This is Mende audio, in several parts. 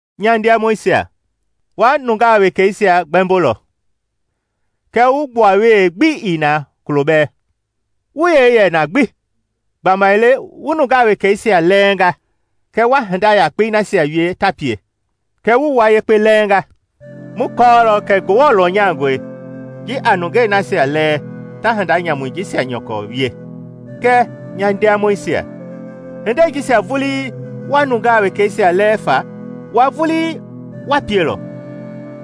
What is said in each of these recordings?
Nya ndiamɔisia, wa nungaa wekeisia gbɛmbolɔ? Kɛ wu gbuawee gbi ii na kulo bɛɛ, wu yee yɛ na gbi. Gbamaile wu nungaa wekeisia lɛɛngaa kɛɛ wa hinda yakpei nasia wie ta pie, kɛ wu wua yekpe lɛɛnga. Mu kɔɔlɔ kɛ Ngewɔ lɔnyangɔe ji a nungei nasia lɛɛ ta hinda nyamui jisia nyɔkɔ wie. Kɛɛ, nya ndiamɔisia, hindei jisia vulii wa nungaa wekeisia lɛɛ faa, wua vulii wa pielɔ!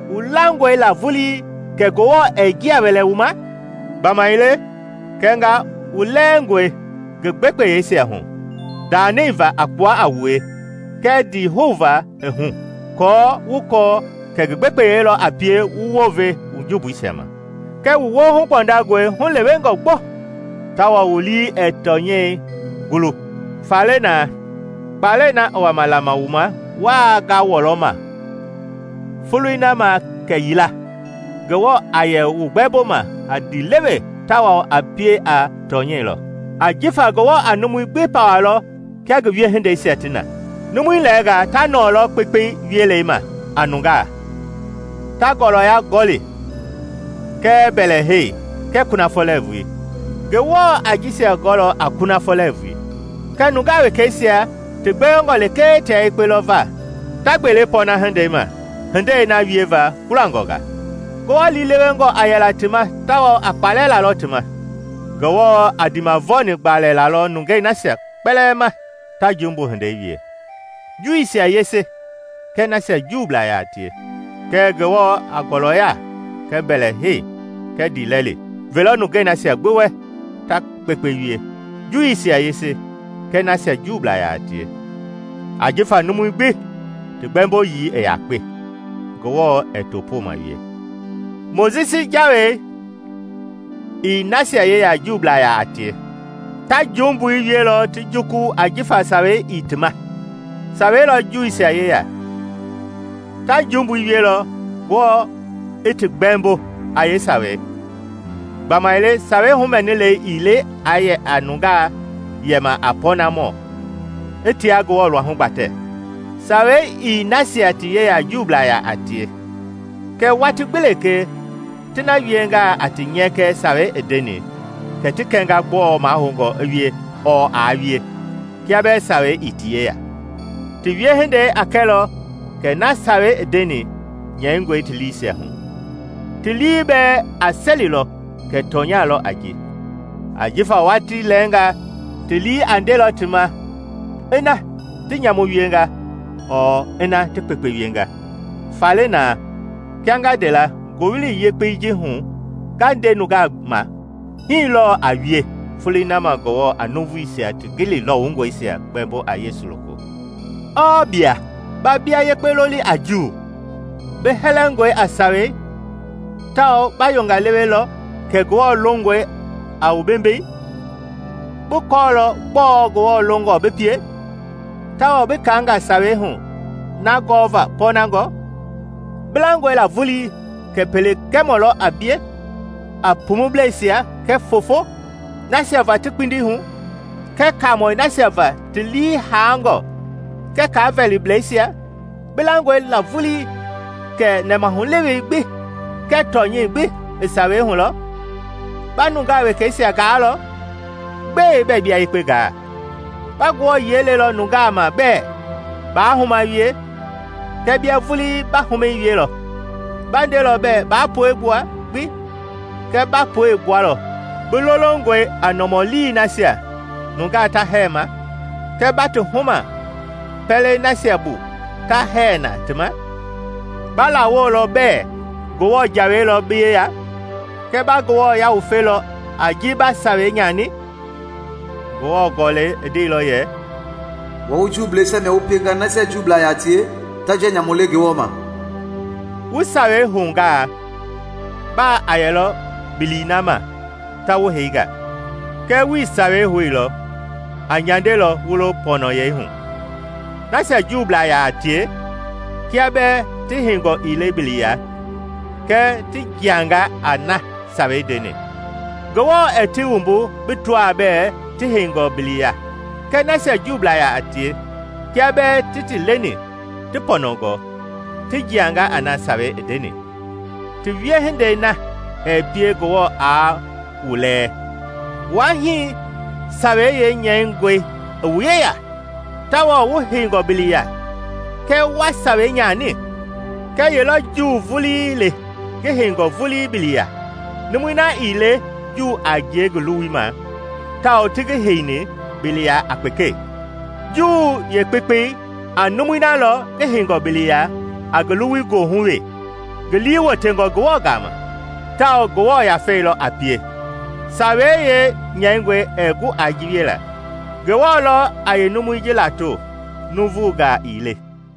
Wu langɔe la vulii kɛ Ngewɔ ɛɛ njia wɛlɛ wu ma? Gbamaile kɛnga wu lɛɛngɔi ngi gbekpeyeisia hu, ndanɛi va a kpua a wue kɛɛ ndihou va i hu, aako kɔɔ kɛ ngi gbekpeyei lɔ a pie wu wounve wu. Kɛɛ wu woohu gbɔndangɔe hulewengɔ gbo, tawao wu lii ɛɛ tɔnyɛi gulu. Faale na, kpalɛi na i wama lama wu ma wuaa ngawɔlɔma Foloi na ma kɛyila Ngewɔ a yɛ wu gbɛmboma a ndiilewe tawao a pie a tɔnyeilɔ. Ajifa Ngewɔ a numui gbi pawalɔ kia ngi wiehindeisia ti na. Numui lɛɛnga ta nɔɔlɔ kpekpei wielei ma a nungaa, ta ngɔlɔya gɔli kɛɛ mbɛlɛhei kɛɛ kunafɔ lɛɛvui: Ngewɔ a jisia gɔlɔ a kunafɔ lɛɛvui. Kɛɛ nungaa wekeisia ti gbewengɔ lekee tia yekpe lɔ va ta gbele pɔɔna-hindei ma hindei na wieva kpulangɔ nga; Ngewɔ liilewengɔ a yɛla ti ma tawao a kpalɛ lalɔ ti ma. Ngewɔ a ndiimavɔni gbalɛ lalɔ nungei nasia kpɛlɛɛ ma ta jumbu hindei wie, Juuisia yese kɛɛ nasia Juublaa yaa tie. Kɛɛ Ngewɔ a ngɔlɔya kɛɛ mbɛlɛhei kɛɛ ndiilɛli velɔ nungei nasia gbi wɛ ta kpekpe wie, Juuisia yese kɛɛ nasia Juublaa yaa tie. Ajifa numui gbi ti gbɛmboyii i yakpe, Ngewɔ ɛɛ topooma wie. Mojisi Jawei ii nasia yeya Juublaa yaa tie; ta jumbui wielɔ ti juku ajifa sawei ii tima. Sawei lɔ Juuisia yeya; ta jumbui wielɔ Ngewɔ i ti gbɛɛmbo a yeesawei. Gbamaile Sawei humɛnilei ii le aa yɛ nungaa yɛma a pɔɔnamɔ i tia Ngewɔ luahu gbatɛ; Sawei ii nasia ti yeya Juublaa yaa tie; kɛɛ watii gbi lekee ti na wiengaa a ti nyɛkɛ Sawei i ndeni, kɛ ti kɛnga gbɔɔ mahoungɔ i wie ɔɔ aa wie, kia bɛɛ Sawei ii ti yeya. Ti wiehindei a kɛlɔ kɛ na Sawei i ndeni nyɛingɔe ti liisia hu. Ti lii bɛɛ a selilɔ kɛ tɔnya lɔ a ji, ajifa watii lɛɛngaa ti lii a ndelɔ ti ma ina ti nyamu wienga ɔɔ ina ti kpekpe wienga. Faale na, kia nga nde la Ngowili Yekpei ji hu nga nde nungaa ma, hii lɔɔ a wie Foloi na ma Ngewɔ a nuuvuisia ti gili lɔwungɔngɔisia gbɛmbo a Yesu loko. Ɔɔ bia? Ba bia yekpe loli a Juu; bi hɛlɛngɔe a Sawei tawao ba yonga lewelɔ kɛ Ngewɔ longɔe a wu bembei; bi kɔɔlɔ gbɔɔ Ngewɔ longɔ bi pie, tawao bi kaanga Sawei hu na gɔva pɔɔnangɔ: bi langɔe la vulii kɛ pele gɛmɔ lɔ a bie a pumublɛisia kɛɛ foofo, nasia va ti kpindi hu kɛɛ kaamɔi nasia va ti lii haangɔ kɛɛ kavɛliblɛisia. Bi langɔe vulii la kɛ nɛmahulewei gbi kɛɛ tɔnyɛi gbi i Sawei hu lɔ. Ba nungaa wekeisia gaalɔ. Gbɛe bɛɛ bia yekpe gaa? Ba Ngewɔ yiɛi lelɔ nungaa ma bɛɛ, “Baa huma wie.” Kɛɛ bia vulii ba humɛi wielɔ? Ba ndelɔ bɛɛ, “Baa puegbua gbi.” Kɛɛ ba puei gbualɔ? Bi lolongɔe a nɔmɔlii nasia nungaa ta hɛɛ ma. Kɛɛ ba ti huma pɛlei nasia bu ta hɛɛ na ti ma? Ba lawolɔ bɛɛ Ngewɔ Jawei lɔ bi yeya. Kɛɛ ba Ngewɔ yawufelɔ a ji ba sawei nyani? Ngewɔ Gɔlɛi i ndeilɔ yɛ, “Wua wu Juuisia mia wu pienga nasia Juublaa yaa tie ta njia nyamu le Ngewɔ ma.” Wu Sawei houngaa, baa a yɛlɔ bili na ma ta wu heinga; kɛɛ wuii Sawei houilɔ, aa nyandelɔ wu lo pɔnɔyɛi hu. Nasia Juublaa yaa tie, kia bɛɛ ti heingɔ ii le bili ya, kɛɛ ti jiangaa a na Sawei ndeni, Ngewɔ ɛɛ ti wumbu bi tɔaa bɛɛ ti heingɔ bili ya? Kɛɛ nasia Juublaa yaa tie, kia bɛɛ ti ti leni ti pɔnɔngɔ, ti jiangaa a na Sawei i ndeni, ti wiehindei na ɛɛ pie Ngewɔ aa wu lɛɛ, wua hii Sawei yeenyɛingɔi i wu yeya tawao wu heingɔ bili ya kɛɛ wa Sawei nyani? Kɛ ye lɔ Juu vulii le ngi heingɔ vulii bili ya? Numui na ii le Juu a ngie ngi luwui ma tawao ti ngi heini bili ya a kpekɛi. Juu yeekpekpei a numui na lɔ ngi heingɔ bili ya a ngi luwui goohu wee, ngi lii wotengɔ Ngewɔ gama; tawao Ngewɔ Yafei lɔ a pie, Sawei yeenyɛingɔi ɛɛ gu a ji wiela. Ngewɔ lɔ a yeenumui ji lato, nuuvugaa ii le.